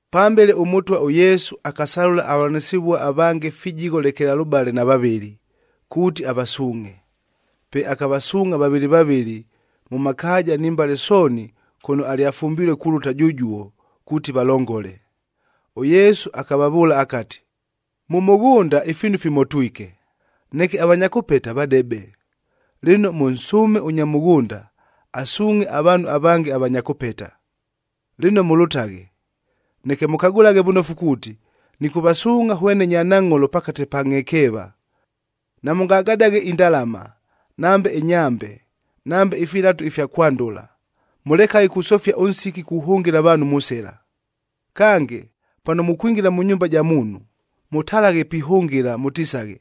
Pambele, ʉMʉtwa ʉYesu akasalʉla avavʉlanɨsɨvua avange fijigho lekelalʉbale na vavɨlɨ, kuuti avasuungʼhe. Pe akavasuungʼha vavɨlɨ vavɨlɨ, mʉ makaaja ni mbale sooni kʉno alyafumbilue kulʉta jʉjuo, kuuti valongole. ɄYesu akavavʉʉla akati, “Mʉ mʉghʉnda ifiinu fimotwike, neke avanya kʉpeta vadebe. Lɨno, mʉnsʉʉme ʉnya mʉghʉnda, asuungʼhe avaanhu avange avanya kʉpeta. Lɨno mʉlʉtaghe, neke mʉkagʉlaghe vʉnofu kuuti, nɨkʉvasuungʼha hwene nyanangʼholo pakate pa ngʼhekeeva! Namʉngagadaghe indalama, nambe ɨnyambe, nambe ifilatu ifya kwandʉla. Mʉlekaghe kusofia ʉnsiki kuhʉngɨla avaanhu mʉ sɨla. “Kange, pano mukwingila mʉ nyumba ja muunhu, mʉtalaghe pihʉngɨla mʉtisaghe,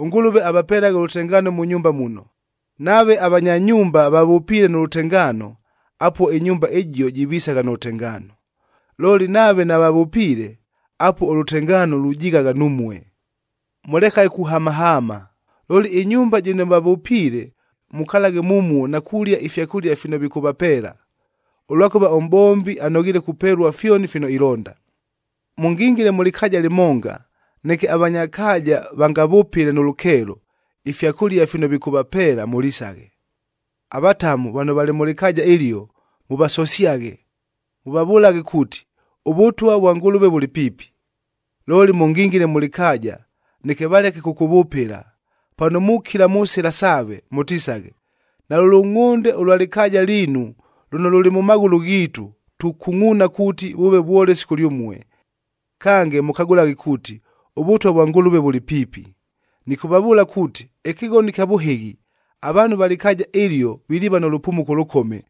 ‘ɄNgʉlʉve avapelaghe ʉlʉtengaano mʉ nyumba muno.’ Nave avanya nyumba vavʉpiile nʉ lʉtengaano, apuo ɨnyumba ɨjio jivisagha nʉ lʉtengaano. Looli, nave navavʉpiile, apuo ʉlʉtengaano lujighagha numue. Mʉlekaghe kuhamahaama. Looli, ɨnyumba jɨno vavʉpiile mukalaghe mumuo na kulia ifyakʉlia fino vikʉvapeela. Ʉlwakʉva ʉmʼbombi anoghiile kupelua fyoni fino ilonda. “Mʉngingile mʉ lɨkaaja lɨmonga, neke avanya kaaja vangavʉpɨle nʉ lʉkeelo, ifyakʉlia fino vikʉvapeela mʉlisaghe. Avatamu vano valɨ mʉ lɨkaaja ɨlio, mʉvasosyaghe. Mʉvavʉlaghe kuuti, ‘ɄVʉtwa vwa Ngʉlʉve vʉlɨ piipi.’ Looli, mʉngingile mʉ lɨkaaja, neke valeke kʉkʉvʉpɨla, pano mukila mʉ sɨla saave, mʉtisaghe, ‘Nalʉ lʉngʼhʉnde ʉlwa lɨkaaja liinu lʉno lʉlɨ mʉ maghʉlʉ ghiitu, tukungʼuuna kuuti vʉʉve vwolesi kʉlyʉmue. Kange, mʉkagʉlaghe kuuti, ʉVʉtwa vwa Ngʉlʉve vʉlɨ piipi!’ Nɨkʉvavʉʉla kuuti, ɨkɨghono ɨkya vʉhɨghi, avaanhu va lɨkaaja ɨlio viliiva nʉ lʉpumuko ʉlʉkome,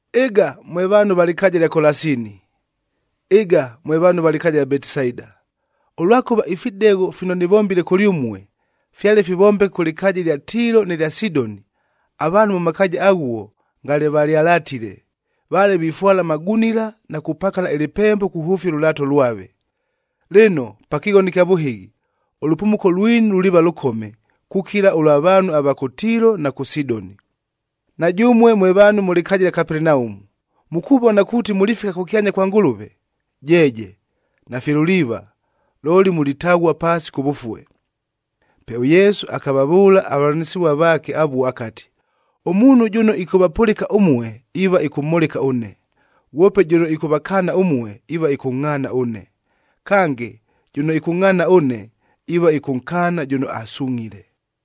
“Ɨga mwe vaanhu va lɨkaaja lya Kolasini! Ɨga mwe vaanhu va lɨkaaja ɨlya Betisaida!b Ʉlwakʉva ifidegho fino nɨvombile kʉlyʉmue, fyale fivombeke kʉ lɨkaaja ɨlya Tiilo nɨ lya Sidoni, avaanhu mʉ makaaja aghuo ngale valyalatile. Vale vifwala amagunila na kupakala ɨlɨpembo kuhʉfia ʉlʉlaato lwave. Lɨno, pa kɨghono ɨkya vʉhɨghi, ʉlʉpumuko lwinu luliiva lʉkome, kukila ʉlwa vaanhu ava kʉ Tiilo na kʉ Sidoni! Na jʉmue mwe vaanhu mʉ lɨkaaja lya Kapelenaumu, mukuvona kuuti mulifika kʉkyanya kwa Ngʉlʉve! Jeeje, nafye luliiva! Looli mulitaghua paasi kʉvʉfue.” Pe ʉYesu akavavʉʉla avavʉlanɨsɨvua vaake avuo akati, “Ʉmuunhu jʉno ɨkʉvapʉlɨka ʉmue, iiva ɨkʉmhʉlɨka ʉne, ghwope jʉno ɨkʉvakaana ʉmue, iiva ɨkʉngʼhaana ʉne. Kange, jʉno ɨkʉngʼhaana ʉne, iiva ɨkʉnkaana jʉno asungʼhile.”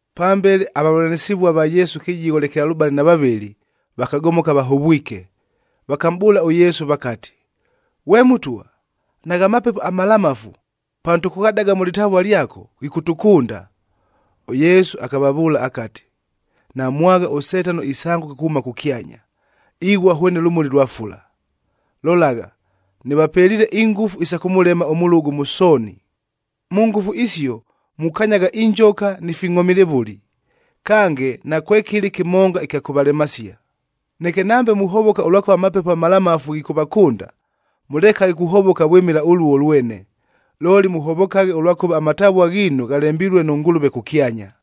Pambele avavʉlanɨsɨvua va Yesu fijigho lekelalʉbale na vavɨlɨ,c vakagomoka vahovwike, vakamʼbʉʉla ʉYesu vakati, “Ghwe Mʉtwa, nagha mapepo amalamafu, pano tʉkʉghadaga mʉ lɨtavua lyako, ghikʉtʉkʉnda!” ɄYesu akavavʉʉla akati, “Namwagha ʉSetano isangʉka kuhʉma kʉkyanya,d ighua hwene lʉmuli lwa fula. Lolagha, nɨvapeliile ingʉfu isa kʉmʉlema ʉmʉlʉgʉ mʉ sooni. Mʉ ngʉfu isio mukanyagha injoka ni fingʼhomilevʉli, kange nakwekɨlɨ kɨmonga ɨkya kʉvalemasia. Neke, nambe muhovoka ʉlwakʉva amapepo amalamafu ghikʉvakʉnda, mʉlekaghe kuhovoka vwɨmɨla ʉluo lwene, looli mʉhovokaghe ʉlwakʉva amatavua ghiinu ghalembilue nʉ Ngʉlʉve kʉkyanya.”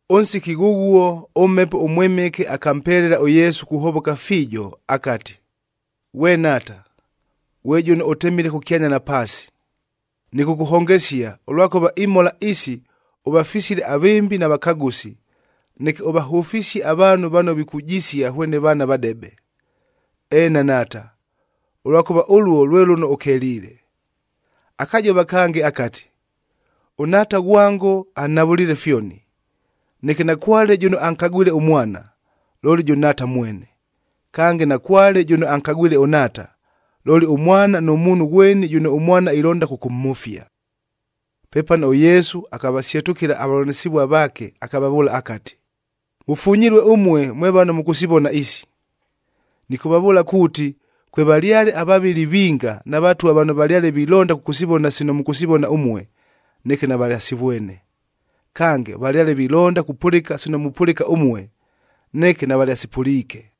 Ʉnsiki ghʉghuo, ʉMhepo ʉMwɨmɨke akampelela ʉYesu kuhovoka fiijo akati, “Ghwe Nhaata, ghwe jʉno ʉtemile kʉkyanya na paasi, nɨkʉkʉhongesia ʉlwakʉva imhola isi ʉvafisile avɨmbi na vakagʉsi, neke ʉvahʉfisie avaanhu vano vikujisia hwene vaana vadebe. Eena Nhaata, ʉlwakʉva ʉluo lwe lʉno ʉkeliile.” Akajova kange akati, “ɄNhaata ghwango anhavʉliile fyoni. Neke nakwale jʉno ankagwile ʉMwana, looli jʉ Nhaata mwene. Kange, nakwale jʉno ankagwile ʉNhaata, looli ʉMwana, nʉ muunhu ghweni jʉno ʉMwana ilonda kʉkʉmhʉfia.” Pepano ʉYesu akavasyetʉkɨla avavʉlanɨsɨvua vaake akavavʉʉla akati, “Mʉfunyilue ʉmue mwe vano mʉkʉsivona isi! Nɨkʉvavʉʉla kuuti, kwevalyale avavɨli vinga na vatwa vano valyale vilonda kʉkʉsivona sino mʉkʉsivona ʉmue, neke navalyasivwene. Kange, valyale vilonda kupʉlɨka sino mupʉlɨka ʉmue, neke navalyasipʉliike.”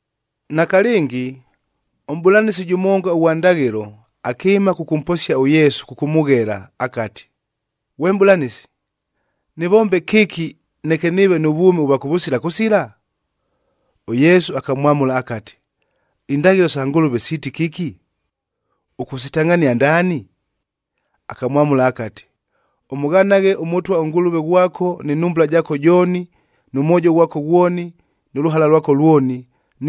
Nakalɨngi, ʉmʼbʉlanɨsi jʉmonga ʉghwa ndaghɨlo, akɨɨma kʉkʉmposia ʉYesu kʉkʉmʉghela akati, “Ghwe Mʼbʉlanɨsi, nɨvombe kɨki, neke nɨɨve nʉ vwʉmi ʉvwa kʉvʉsila kʉsila?” ɄYesu akamwamʉla akati, “Indaghɨlo sa Ngʉlʉve siiti kɨki? Ʉkʉsitangʼhania ndaani?” Akamwamʉla akati, “Ʉmʉghanaghe ʉMʉtwa ʉNgʉlʉve ghwako nɨ nhumbula jaako jooni, nʉ mwojo ghwako ghwoni, nʉ lʉhala lwako lwoni,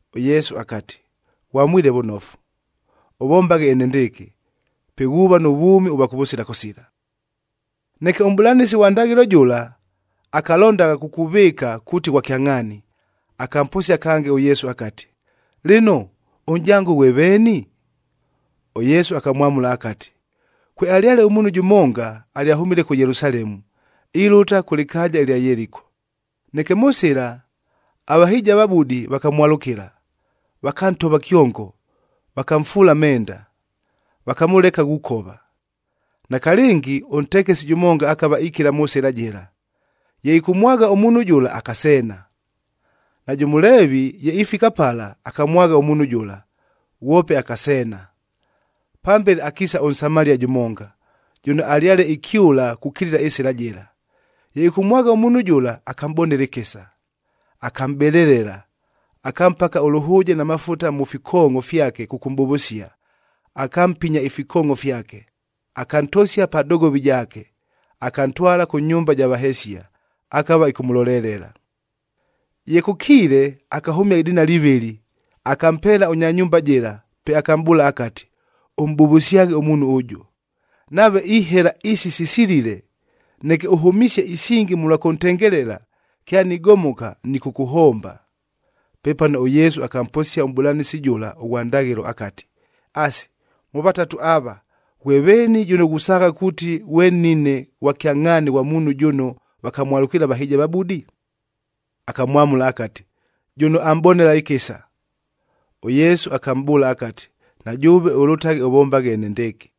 ɄYesu akati, “Ghwamwile vʉnofu! Ʉvombaghe enendɨɨkɨ, pe ghuuva nʉ vwʉmi ʉvwa kʉvʉsila kʉsila.” Neke ʉmʼbʉlanɨsi ghwa ndaghɨlo jʉla, akalondagha kukuvɨɨka kuuti ghwa kyangʼhaani, akamposia kange ʉYesu akati, “Lɨno, ʉnʼjango ghwe veeni?” ɄYesu akamwamʉla akati, “Kwealyale ʉmuunhu jʉmonga, alyahʉmile kʉ Yelusalemu, ilʉta kʉ lɨkaaja ɨlya Yeliko. Neke mʉ sɨla, avahɨjiavabudi vakamwalʉkɨla, vakantova kyongo, vakamfuula amenda, vakamʉleka ghukova. Nakalɨngi ʉntekesi jʉmonga akava ikila mʉ sɨla jɨla, ye ɨkʉmwagha ʉmuunhu jʉla akaseena. Najʉ Mʉleevi,g ye ifika pala, akamwagha ʉmuunhu jʉla, ghwope akaseena. Pambele akiisa ʉNsamalia jʉmonga, jʉno alyale ikyʉla kukilila ɨsɨla jɨla. Ye ɨkʉmwagha ʉmuunhu jʉla, akamʼbonela ɨkɨsa, akamʼbelelela, akampaka ʉlʉhʉʉje na mafuta mʉ fikoongʼo fyake kʉkʉmʼbʉvʉsia, akampinya ifikoongʼo fyake. Akantosia pa dogovi jaake, akantwala kʉ nyumba ja vahesia, akava ɨkʉmʉlolelela. “Ye kʉkiile, akahʉmia idinali ivɨlɨ,h akampeela ʉnya nyumba jɨla, pe akamʼbʉʉla akati, ‘Ʉmʼbʉvʉsyaghe ʉmuunhu ʉjʉ. Nave ihela isi sisilile, neke ʉhʉmisie isingi mʉlwa kʉntengelela, kyanigomoka, nɨkʉkʉhomba.’” Pepano, ʉYesu akamposia ʉmʼbʉlanɨsi jʉla ʉghwa ndaghɨlo akati, “Asi, mʉ vatatu ava, ghwe veeni jʉno ghusaagha kuuti ghwe nnine ghwa kyangʼhaani ghwa muunhu jʉno vakamwalʉkiile avahɨjiavabudi?” Akamwamʉla akati, “Jʉno amʼbonela ɨkɨsa.” ɄYesu akamʼbʉʉla akati, “Na jʉʉve ʉlʉtaghe ʉvombaghe enendɨɨkɨ!”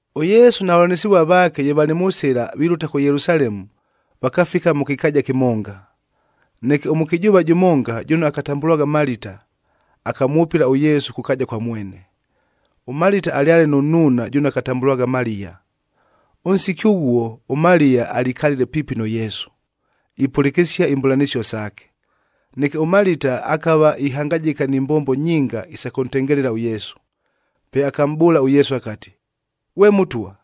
ɄYesu na vavʉlanɨsɨvua vaake, ye valɨ mʉ sɨla vilʉta kʉ Yelusalemu, vakafika mʉ kɨkaaja kɨmonga. Neke ʉmʉkɨjʉʉva jʉmonga, jʉno akatambʉlwagha Malita, akamwʉpɨla ʉYesu kʉ kaaja kwa mwene. ɄMalita alyale nʉ nnuuna jʉno akatambʉlwagha Maliya. Ʉnsiki ʉghuo, ʉMaliya alikalile piipi nʉ Yesu, ipʉlɨkɨsia imbʉlanɨsio saake. Neke ʉMalita akava ihangajɨka ni mbombo nyinga isa kʉntengelela ʉYesu. Pe akamʼbʉʉla ʉYesu akati, “Ghwe Mʉtwa,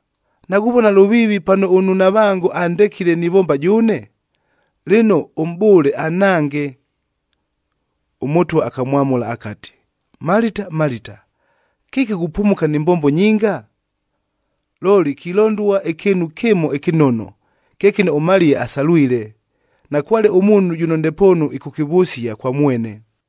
naghuvona lʉviivi pano ʉnnunavango andekile nivomba jʉʉne? Lɨno, ʉmʼbʉʉle anhange!” ɄMʉtwa akamwamʉla akati, “Malita, Malita! Kɨki ghupumuka ni mbombo nyinga? Looli kilondua ɨkɨɨnu kɨmo ɨkɨnono, kye kɨno ʉMaliya asalwile, nakwale ʉmuunhu jʉno ndepoonu ɨkʉkɨvʉsia kwa mwene.”